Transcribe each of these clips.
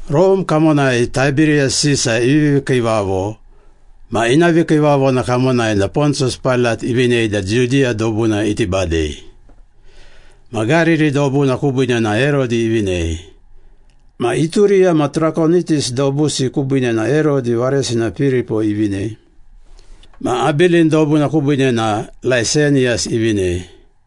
Rome kamonai Taiberiyas Sisa ivivi kiivavo ma ina vikiivavona kamonai na Pontiyas Pailat ivinei da Judiya dobuna iti badei. Ma Gariri dobuna kubiine na Herodi ivinei. Ma Ituriya ma Trakonitis dobusi kubiine na Herodi varesina Piripo ivinei. Ma Abilin dobuna kubiine na Laiseniyas ivinei.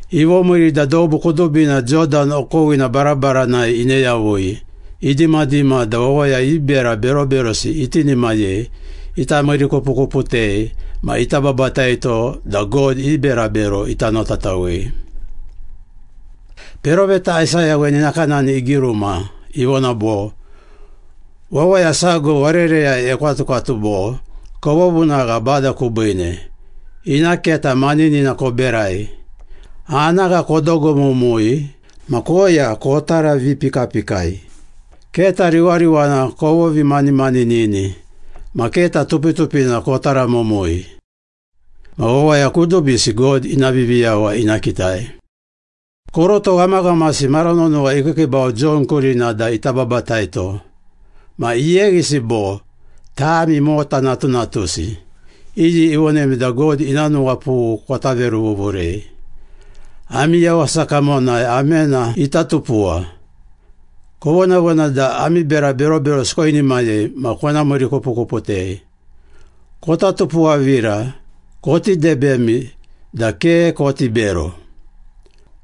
Ivomiiri da dobu kudubina Jodan okowina barabaranai ine yavui, idimadima da wawaya i bera beroberosi itinimayei, ita miirikupukuputei ma ita babataito da God i berabero ita notatawei. Peroveta Aisaya weni nakanani igiruma, ivona bo, “Wawaya sago warereyai ekwatukwatu bo, ‘Kovovunagha Bada kubiine, Ina keta maninina koberai. Anagha kodogomumui ma koya kotaravipikapikai. Keta riwariwana kovovimanimanini Ma keta tupitupina kotaramumui. Ma wawaya kudubisi God ina Viviyawa ina kitai.’” Koroto ghamaghamasi mara nonowa ikiikiibau Jon kurina da ita babataito. Ma iyeghisi bo, “Tami mota natunatusi! Iyi ivonemi da God ina nuwapughu kota veruvuvurei? Ami yawasa kamonai amena ita tupuwa. Kovonavona da ami bera beroberosi koinimayei ma kona miirikupukuputei. Kota tupuwavira, koti debemi da ke koti bero.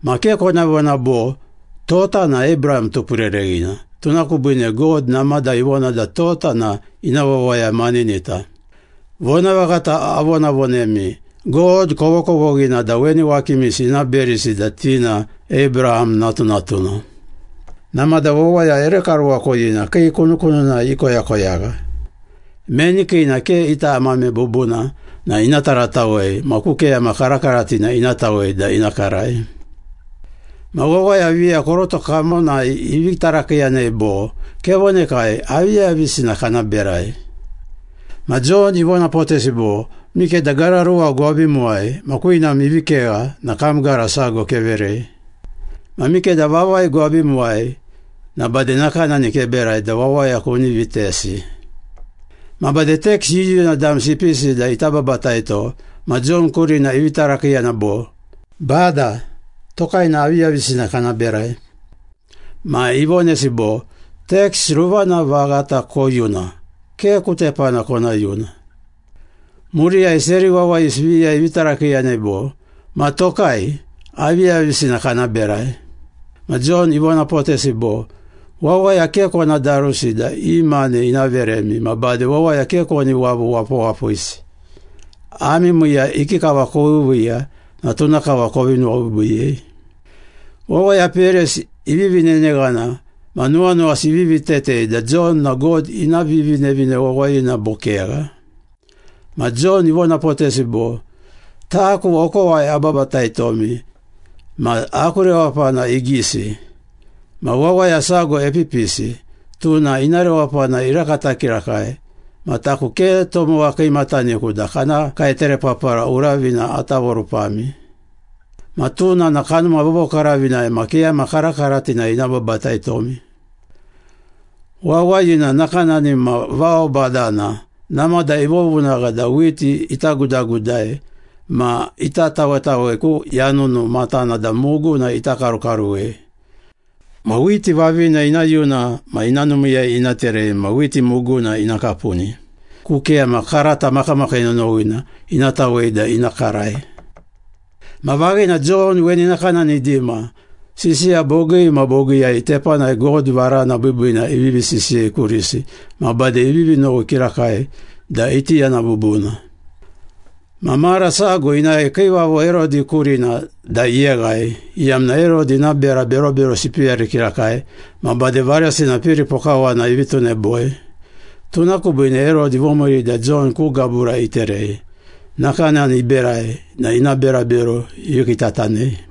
Ma ke kona vona bo, ‘Tota na Abraham tupurereghina, tuna kubiine God namada ivona da tota na ina wawaya maninita.’ Vonavaghata avonavonemi, God kovokovoghina da weni wakimisi ina berisi da ti na Abraham natunatuna. Namada wawaya ere karuwakoyina kii kunukununai ikoyakoyagha. Meni kiina ke ita amame bubuna na ina taratawei ma ku keyama karakaratina ina tawei da ina karai.” Ma wawaya viya koroto kamonai ivi tarakiiyanei bo, “Kevonekai, aviyavisina kana berai?” Ma Jon ivonapotesi bo, “Mikeda gara ruwa gwabimuwai ma kwinam ivi kegha na kam gara sago keverei. Ma mikeda vavai gwabimuwai na bade nakanani keberai da wawaya kuni vitesi.” Ma bade teks yuyuna damsi ipisi da ita babataito ma Jon kurina ivi tarakiiyana bo, “Bada, tokai na aviyavisina kana berai?” Ma ivonesi bo, “Teks ruvana vaghata koyuna. Ke ku tepana kona yuna.” Muriyai seri wawayisi viya ivi tarakiiyanei bo, “Ma tokai, aviyavisina kana berai?” Ma Jon ivonapotesi bo, “Wawaya ke kona darusi da i mane ina veremi ma bade wawaya ke koni wavu wapawapisi. Ami miiya ikikava koviiviiya na tuna kava kovi nuwabiibiiyei.” Wawaya peyarisi ivivi neneghana ma nuwanuwasi ivivi tetei da Jon na God ina Vivinevine Wawayina bo kegha. Ma Jon ivonapotesi bo, “Taku okowai ababataitomi ma aku rewapana igisi. Ma wawaya sago epipisi, tuna ina rewapana irakata kirakai ma taku ke tomowa kiimataniku da kana kaeterepapara uravina ata vorupami. Ma tuna na Kanuma Vovokaravinai ma keyama karakaratinai ina babataitomi. Wawayina nakanani ma vao badana, namada ivovunagha da whiti ita gudagudai ma ita tawetawei ku yanunu matana da muguna ita karukaruwei. Ma whiti vavina ina yuna ma ina numiiyai ina terei ma whiti muguna ina kapuni, ku keyama karata makamakii nonowina ina tawei da ina karai.” Ma vaghina, Jon weni nakanani idima, sisiya bogii ma bogiiyai tepanai God varana biibiina ivivi sisiyei kurisi ma bade ivivi nowi kirakai da iti yana bubuna. Ma mara sago inae Kiivavo Herodi kurina da iyeghai, iyamna Herodi ina bera beroberosi ipeyari kirakai ma bade varesina Piripo kawana ivi tuneboi. Tuna kubiine Herodi ivomiiri da Jon ku gabura iterei. Nakanani iberai na ina berabero ivi kiitatanei.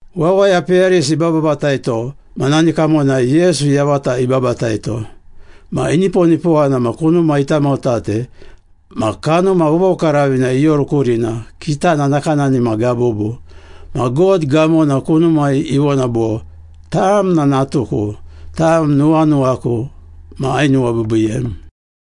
Wawaya peyarisi ibababataito na nani kamonai Yesu yavata ibabataito. Ma iniponipowana na kunuma itamotate ma Kanuma Vovokaravina ioru kurina, kitana nakanani ma gabubu. Ma God gamona kunumai ivona bo, “Tam na natuku. Tam nuwanuwaku ma ainuwabiibiiyem.”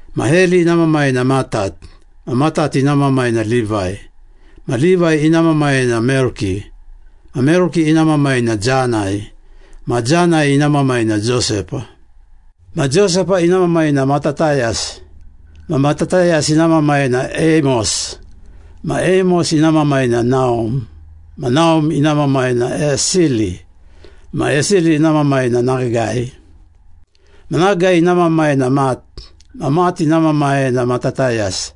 Ma Heli ina mamai na Matat. Ma Matat ina mamai na Livai. Ma Livai ina mamai na Melki. Ma Melki ina mamai na Janai. Ma Janai ina mamai na Josepa. Ma Josepa ina mamai na Matatayas. Ma Matatayas ina mamai na Eimos. Ma Eimos ina mamai na Naum. Ma Naum ina mamai na Esili. Ma Esili ina mamai na Nagai. Ma Nagai ina mamai na Mat. Ma Mat ina mamai na Matatayas.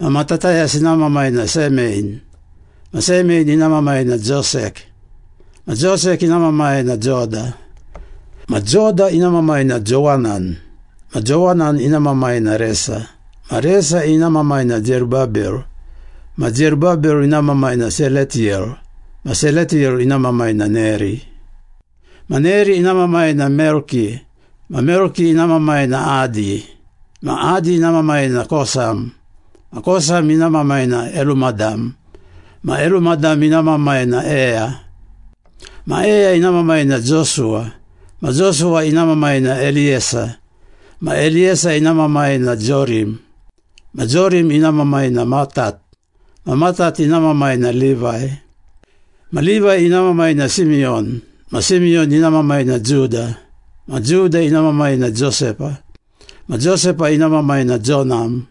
Ma Matatayas ina mamai na Semein. Ma Semein ina mamai na Josek. Ma Josek ina mamai na Joda. Ma Joda ina mamai na Jowanan. Ma Jowanan ina mamai na Resa. Ma Resa ina mamai na Zerubabel. Ma Zerubabel ina mamai na Seletiyel. Ma Seletiyel ina mamai na Neri. Ma Neri ina mamai na Melki. Ma Melki ina mamai na Adi. Ma Adi ina mamai na Kosam. Ma Kosam ina mamai na Elumadam. Ma Elumadam ina mamai na Eya. Ma Eya ina mamai na Josuwa. Ma Josuwa ina mamai na Eliyesa. Ma Eliyesa ina mamai na Jorim. Ma Jorim ina mamai na Matat. Ma Matat ina mamai na Livai. Ma Livai ina mamai na Simiyon. Ma Simiyon ina mamai na Juda. Ma Juda ina mamai na Josepa. Ma Josepa ina mamai na Jonam.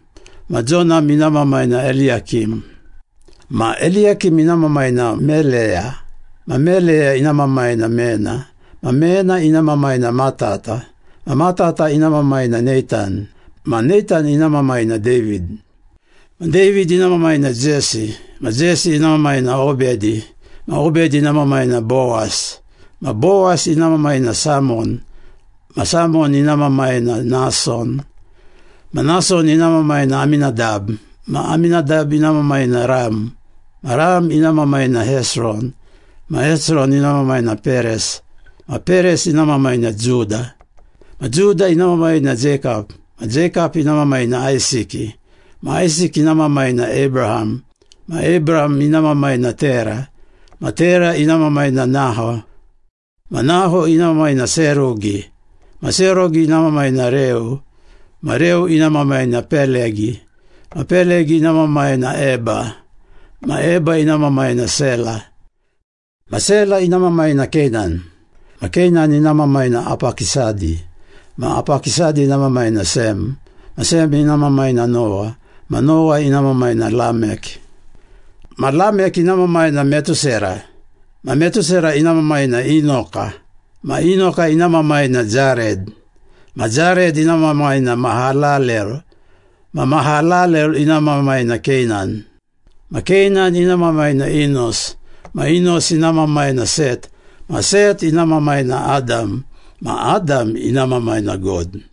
Ma Jonam ina mamai na Eliyakim. Ma Eliyakim ina mamai na Meleya. Ma Meleya ina mamai na Mena. Ma Mena ina mamai na Matata. Ma Matata ina mamai na Neitan. Ma Neitan ina mamai na David. Ma David ina mamai na Jesi. Ma Jesi ina mamai na Obedi. Ma Obedi ina mamai na Bowas. Ma Bowas ina mamai na Samon. Ma Samon ina mamai na Nason. Ma Nason ina mamai na Aminadab. Ma Aminadab ina mamai na Ram. Ma Ram ina mamai na Hesron. Ma Hesron ina mamai na Peres. Ma Peres ina mamai na Juda. Ma Juda ina mamai na Jeikap. Ma Jeikap ina mamai na Aisiki. Ma Aisiki ina mamai na Abraham. Ma Abraham ina mamai na Tera. Ma Tera ina mamai na Naho. Ma Naho ina mamai na Serugi. Ma Serugi ina mamai na Reu. Ma Reu ina mamai na Pelegi. Ma Pelegi ina mamai na Eba. Ma Eba ina mamai na Sela. Ma Sela ina mamai na Keinan. Ma Keinan ina mamai na Apakisadi. Ma Apakisadi ina mamai na Sem. Ma Sem ina mamai na Nowa. Ma Nowa ina mamai na Lamek. Ma Lamek ina mamai na Metusera. Ma Metusera ina mamai na Inoka. Ma Inoka ina mamai na Jared. Ma Jared ina mamai na Mahalalel. Ma Mahalalel ina mamai na Keinan. Ma Keinan ina mamai na Inos. Ma Inos ina mamai na Set. Ma Set ina mamai na Adam. Ma Adam ina Mamai na God.